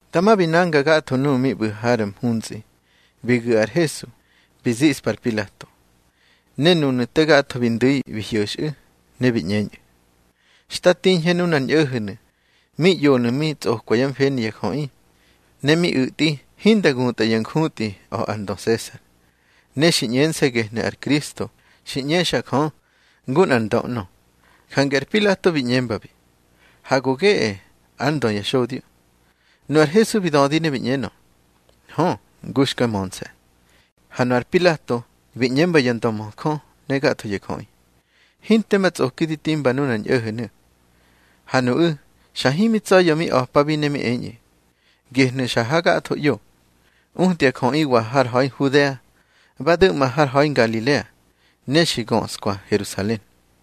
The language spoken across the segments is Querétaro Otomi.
Dama bi nanga gatho nuꞌu̱ mi ꞌbu̱ har mhuntsꞌi, bi gu̱ ar Hesu bi ziꞌspa ar Pilato. Ne nunu̱ te gatho bi ndu̱i bi hyo̱xꞌu̱, ne bi ꞌñeñꞌu̱: —Xta tiñhe nunar ñꞌo̱ho̱nu̱ mi ꞌyonu̱ mi tsꞌokwa yá mfeni ya jöꞌi, ne mi u̱tꞌi hinda gutꞌa yá njutꞌi a̱ ar ndö Sesar. Ne xi ꞌñense̱ gehnu̱ ar Kristo xi ꞌñexa Jö ngu nꞌar ndö ꞌnö. Jange ar Pilato bi ꞌñembabi: —Ha go geꞌe ár Ndö ya xodyo. Nu ar Hesu bi dödi ne bi ꞌñenö: —Hö, ngu xka mönse̱. Ha nu ar Pilato bi ꞌñemba ya ndömöjö ne gatho ya jöꞌi: —Hinte ma tsꞌoki di timba nunar ñꞌo̱ho̱nu̱. Ha nuꞌu̱ xa himi tsa̱ya̱ mi a̱pabi ne mi eñꞌu̱: —Gehnu̱ xa hagatho ꞌyo, utya jöꞌiwa har ha̱i Nhudea, ba du̱ꞌma har ha̱i Ngalilea, ne xi göꞌskwa Herusalen.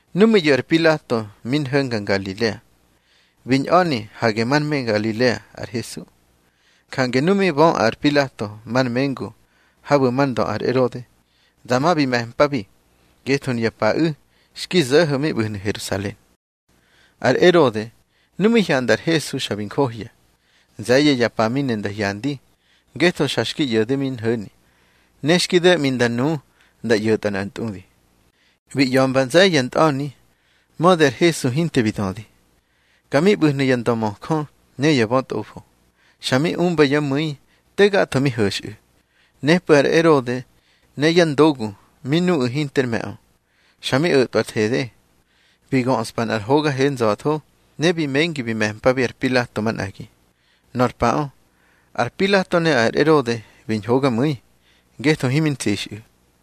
Nu mi ꞌyo̱ ar Pilato mi nho̱nga Ngalilea, bi ñꞌa̱ni hage már me Ngalilea ar Hesu. Jange nu mi bö ar Pilato már mengu habu̱ már ndö ar Erode, dama bi me̱mpabi, ngetho nuya paꞌu̱ xki zo̱ho̱ mi ꞌbu̱hnu̱ Herusalen. Ar Erode, nu mi hyanda ar Hesu, xa bi njohya. Nze̱ye̱ ya pa mi ne nda hyandi, ngetho xa xki ꞌyo̱de mi nho̱ni. Ne xki do̱ꞌmi nda nu nda ꞌyo̱tꞌa nꞌar ntꞌudi. Bi ꞌya̱mba nze̱ye̱ ya ntꞌa̱ni, mödi ar Hesu hinte bi dödi. Ka mi ꞌbu̱hnu̱ ya ndömöjö ne ya bötꞌofo, xa mi umba yá mu̱i te gatho mi ho̱xꞌu̱. Nepꞌu̱ ar Erode ne yá ndogu mi nuꞌu̱ hinter me̱ꞌö, xa mi o̱tꞌwa ar thede, bi göꞌspa nꞌar hoga he nza̱tho, ne bi mengi bi me̱mpa ar Pilato manꞌagi. Nor paꞌö, ar Pilato ne ar Erode bi ñhogamu̱i, ngetho himi ntsixꞌu̱.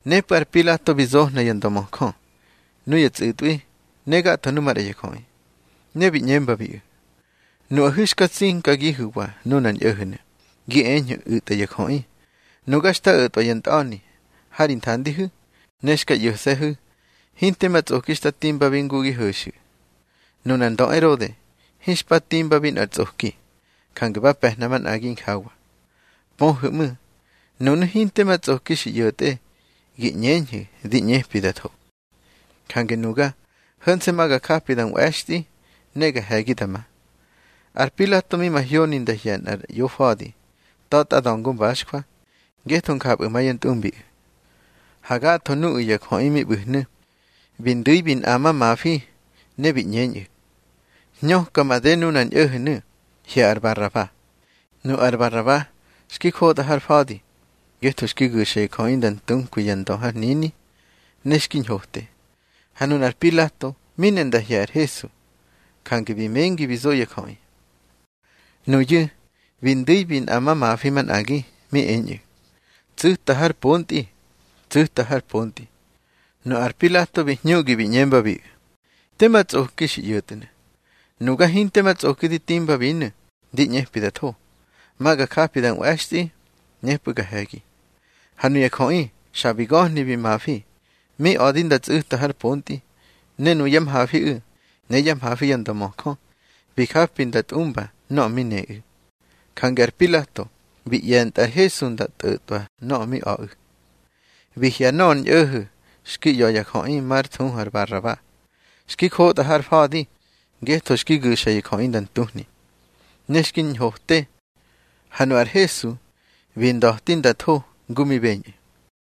Nepꞌu̱ ar Pilato bi zohna ya ndömöjö, nuya tsꞌu̱tꞌwi, ne gatho nu maꞌra ya jöꞌi. Ne bi ꞌñembabiꞌu̱: —Nuꞌahu̱ xka tsinkagihu̱wa nunar ñꞌo̱ho̱nu̱, gi eñhu̱ u̱tꞌa ya jöꞌi. Nuga xta o̱tꞌwa ya ntꞌa̱ni ha ri nthandihu̱, ne xka ꞌyo̱se̱hu̱ hinte ma tsꞌoki xta timbabi ngu gi ho̱xu̱. Nunar ndö Erode hinxpa timba nꞌar tsꞌoki, jange ba pe̱hna manꞌagi injawa. Pöhu̱ ꞌmu̱, nunu̱ hinte ma tsꞌoki xi ꞌyo̱tꞌe gi ꞌñeñhu̱ di ꞌñepi da tho. Jange nuga, ho̱nse̱ ma ga japi nda nꞌwe̱xtꞌi, ne ga he̱gi da ma. Ar Pilato mi mahyoni nda hye̱ nꞌar ꞌyofa̱di ta̱tꞌa da̱ngo mbaxjwa, ngetho njapꞌu̱ ma yá ntꞌumbiꞌu̱. Ha gatho nuꞌu̱ ya jöꞌi mi ꞌbu̱hnu̱, bi ndu̱i bi nꞌamamafi, ne bi ꞌñeñꞌu̱: —Hñöka made nunar ñꞌo̱ho̱nu̱. Hye̱ ar Baraba. Nu ar Baraba xki njotꞌa har fa̱di, ngetho xki gu̱xa ya jöꞌi nda ntunkwi ya ndö har hnini, ne xki ñhote. Ha nunar Pilato mi ne nda hye̱ ar Hesu, jange bi mengi bi zo ya jöꞌi. Nuyu̱ bi ndu̱i bi nꞌamamafi manꞌagi, mi eñꞌu̱: —Tsu̱ta har pontꞌi, tsu̱ta har pontꞌi. Nu ar Pilato bi hñuꞌgi bi ꞌñembabiꞌu̱: —Te ma tsꞌoki xi ꞌyo̱tnu̱. Nuga hinte ma tsꞌoki di timbabinu̱ di ꞌñepi da tho. Ma ga japi da nꞌwe̱xtꞌi, nepꞌu̱ ga he̱gi. Ha nuya jöꞌi xa bi ga̱hni bi mafi, mi a̱di nda tsu̱ta har pontꞌi. Ne nuyá mhafiꞌu̱, ne yá mhafi ya ndömöjö, bi japi nda tꞌumba nöꞌö mi neꞌu̱. Jange ar Pilato bi ꞌye̱ntꞌa ar Hesu nda tꞌo̱tꞌwa nöꞌö mi a̱ꞌu̱. Bi hye̱ nöꞌö ar ñꞌo̱ho̱ xki ꞌya̱ ya jöꞌi, már thuhu Baraba, xki njotꞌa har fa̱di ngetho xki gu̱xa ya jöꞌi nda ntuhni, ne xki ñhote. Ha nu ar Hesu bi nda̱ti nda tho ngu mi beñꞌu̱.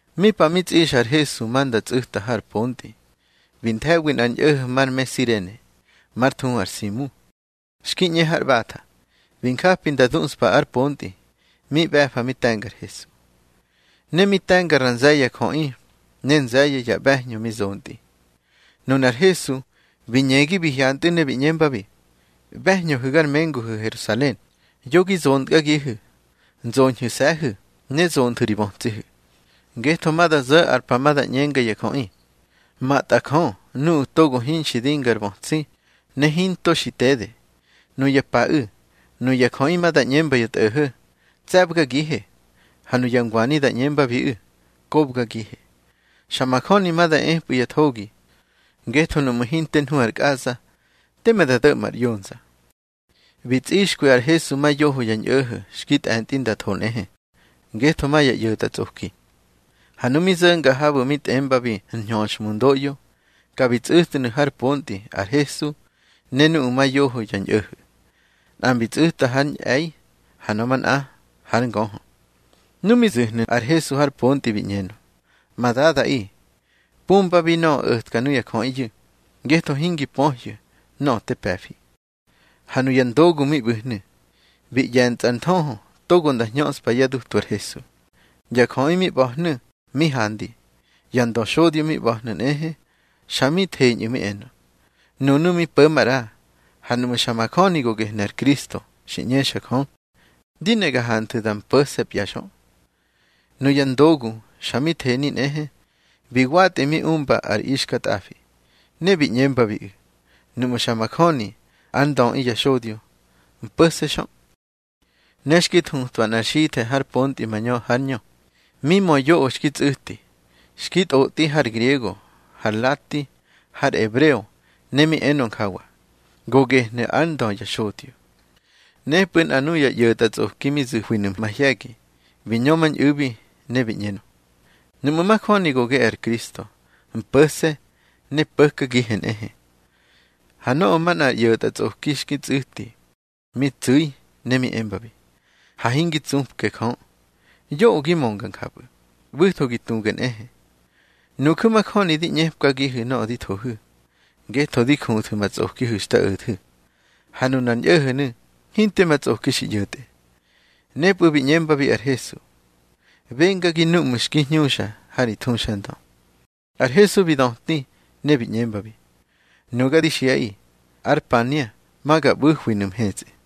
Mi pa mi tsꞌixa ar Hesu ma nda tsu̱ta har pontꞌi, bi nthe̱wi nꞌar ñꞌo̱ho̱ mar me Sirene, már thuhu ar Simu, xki ꞌñe har ꞌbatha. Bi njapi bi duꞌspa ár pontꞌi, mi ꞌbe̱fa mi te̱nga ar Hesu. Ne mi te̱nga ra nze̱ye̱ ya jöꞌi, ne nze̱ye̱ ya ꞌbe̱hñö mi zontꞌi. Nunar Hesu bi ñegi bi hyantꞌu̱, ne bi ꞌñembabi: —ꞌBe̱hñöhu̱ gar menguhu̱ Herusalen, yo gi zontkagihu̱, nzoñhu̱se̱hu̱ ne zonthu̱ ri bötsihu̱. Ngetho ma da zo̱ ar pa ma da ꞌñenga ya jöꞌi: Matꞌa Jö nuꞌu̱ togo hinxi dinga ar bötsi, ne hinto xi tede. Nuya paꞌu̱ nuya jöꞌi ma da ꞌñemba ya tꞌo̱ho̱: Tse̱bgagihe. Ha nuya ngwani da ꞌñembabiꞌu̱: Kobgagihe. Xa majöni ma da epꞌu̱ ya thogi, ngetho nuꞌmu̱ hinte nhu ar kꞌaza, teme da do̱ꞌma ar ꞌyonza. Bi tsꞌixkwi ar Hesu ma yoho ya ñꞌo̱ho̱ xki tꞌe̱ntꞌi nda tho nꞌehe, ngetho ma ya ꞌyo̱tꞌatsꞌoki. Ha nu mi zo̱nga habu̱ mi tꞌembabi Nñöxhmundoꞌyo, ka bi tsꞌu̱tnu̱ har pontꞌi ar Hesu ne nuꞌu̱ ma yoho ya ñꞌo̱ho̱, nꞌa bi tsꞌu̱ta hár ñꞌe̱i, ha nöꞌö manꞌa hár ngöhö. Nu mi zu̱hnu̱ ar Hesu har pontꞌi, bi ꞌñenö: —Ma Dadaꞌi, pumbabi nöꞌö o̱tka nuya jöꞌiyu̱, ngetho hingi pöhyu̱ nöꞌö te pe̱fi. Ha nuya ndogu mi ꞌbu̱hnu̱, bi ꞌye̱ntsꞌa ar nthöhö togo nda hñöꞌspa yá dutu ar Hesu. Ya jöꞌi mi ꞌba̱hnu̱ mi handi, ya ndöxodyo mi ꞌba̱hnu̱ nꞌehe, xa mi theñꞌu̱ mi enö: —Nunu̱ mi po̱ maꞌra, ha nuꞌmu̱ xa majöni go gehnu̱ ar Kristo xi ꞌñexa Jö, di ne ga hanthu̱ da mpo̱se̱pya xö. Nuya ndogu xa mi theni nꞌehe, bi watꞌi mi umba ar ixkatꞌafi. Ne bi ꞌñembabiꞌu̱: —Nuꞌmu̱ xa majöni ár Ndöꞌi ya xodyo, mpo̱se̱ xö. Ne xki thutwa nꞌar xithe̱ har pontꞌi mañö hár ñö, mi mö yoꞌö xki tsꞌu̱ti. Xki tꞌotꞌi har griego, har lati, har ebreo, ne mi enö njawa: Go gehnu̱ ár Ndö ya xodyo. Nepꞌu̱ nꞌa nuya ꞌyo̱tꞌatsꞌoki mi zu̱hwinu̱ mahye̱gi, bi ñömañꞌu̱bi, ne bi ꞌñenö: —Nuꞌmu̱ majöni go geꞌe ar Kristo, mpo̱se̱ ne po̱kagihe nꞌehe. Ha nöꞌö manꞌa ar ꞌyo̱tꞌatsꞌoki xki tsꞌu̱ti, mi tsu̱i ne mi embabi: —Ha hingi tsupke Jö, yoꞌö gi mönga njapꞌu̱. ꞌBu̱tho gi tuge nꞌehe. Nuju̱ majöni di ꞌñepkagihu̱ nöꞌö di thohu̱, ngetho di juthu̱ ma tsꞌokihu̱ xta o̱thu̱. Ha nunar ñꞌo̱ho̱nu̱ hinte ma tsꞌoki xi ꞌyo̱tꞌe. Nepꞌu̱ bi ꞌñembabi ar Hesu: —Bengagi núꞌmu̱ xki hñuxa ha ri thuxandö. Ar Hesu bi döti ne bi ꞌñembabi: —Nuga di xiꞌaꞌi, ár pania ma ga ꞌbu̱hwinu̱ mhetsꞌi.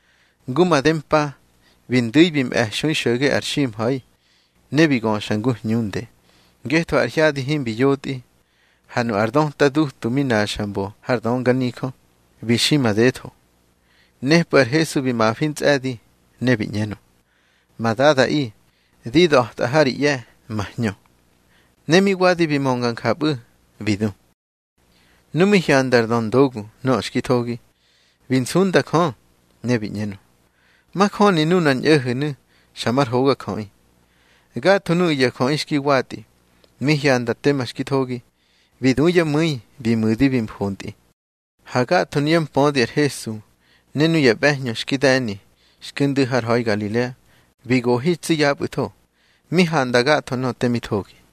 Ngu made mpa bi ndu̱i bi mꞌe̱xui xo̱ge ar ximha̱i, ne bi göxa ngu hñunde, ngetho ar hyadi himbi yotꞌi. Ha nu ar döta dutu mi naxa mbo har dönganijö, bi xi madetho. Nepꞌu̱ ar Hesu bi mafi ntsꞌe̱di ne bi ꞌñenö: —Ma Dadaꞌi, di da̱tꞌa ha ri ꞌye̱ ma hñö. Ne mi wadi bi mönga njapꞌu̱, bi du. Nu mi hyanda ar döndogu nöꞌö xki thogi, bi nsunda Jö, ne bi ꞌñenö: —Majöni nunar ñꞌo̱ho̱nu̱ xa mar hogajöꞌi. Gatho nuꞌu̱ ya jöꞌi xki watꞌi, mi hyanda tema xki thogi, bi du yá mu̱i bi mu̱di bi mfontꞌi. Ha gatho nuyá mpödi ar Hesu, ne nuya ꞌbe̱hñö xki de̱ni xki ndu̱ har ha̱i Ngalilea, bi gohi tsi yapꞌu̱tho, mi handa gatho nöꞌö te mi thogi.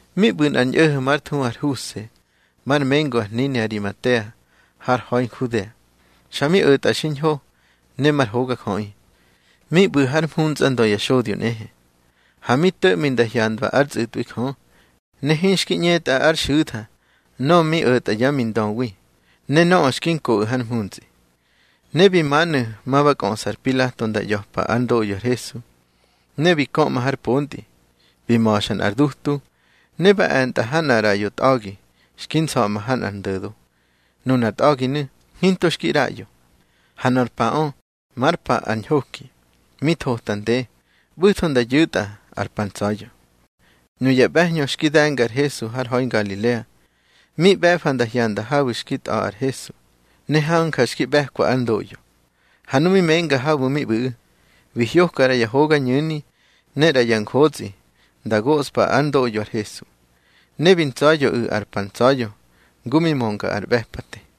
Mi ꞌbu̱ nꞌar ñꞌo̱ho̱ már thuhu ar Huse, már mengu ar hnini Arimatea har ha̱i Nhudea, xa mi o̱tꞌa xiñho ne mar hogajöꞌi. Mi ꞌbu̱ hár mhuntsꞌandö ya xodyo nꞌehe. Ha mi to̱ꞌmi nda hyandwa ár tsꞌu̱tꞌwi Jö, ne hinxki ꞌñetꞌa ár xu̱tha nöꞌö mi o̱tꞌa yá mindöwi, ne nöꞌö xki nkoꞌu̱ har mhuntsꞌi. Ne bi manu̱ ma ba kꞌöꞌsa ar Pilato nda ꞌya̱pa ár ndoꞌyo ar Hesu. Ne bi köꞌma har pontꞌi, bi ma̱xa nꞌar dutu, ne ba e̱ntꞌa ha nꞌar ꞌraꞌyo tꞌa̱gi xki nsa̱ꞌma ha nꞌar ndo̱do. Nunar tꞌa̱ginu̱ hinto xki ꞌraꞌyo. Ha nor paꞌö már pa ar ñhoki, mi thota nde, ꞌbu̱tho nda yu̱tꞌa ar pa ntsa̱ya̱. Nuya ꞌbe̱hñö xki de̱nga ar Hesu har ha̱i Ngalilea, mi ꞌbe̱fa nda hyanda habu̱ xki tꞌa̱ ar Hesu, ne hanja xki ꞌbe̱kwa ár ndoꞌyo. Ha nu mi menga habu̱ mi ꞌbu̱ꞌu̱, bi hyoka ꞌra ya hogañu̱ni ne ꞌra ya njotsꞌi nda goꞌspa ár ndoꞌyo ar Hesu. Ne bi ntsa̱ya̱ꞌu̱ ar pa ntsa̱ya̱ ngu mi mönga ar ꞌbe̱pate.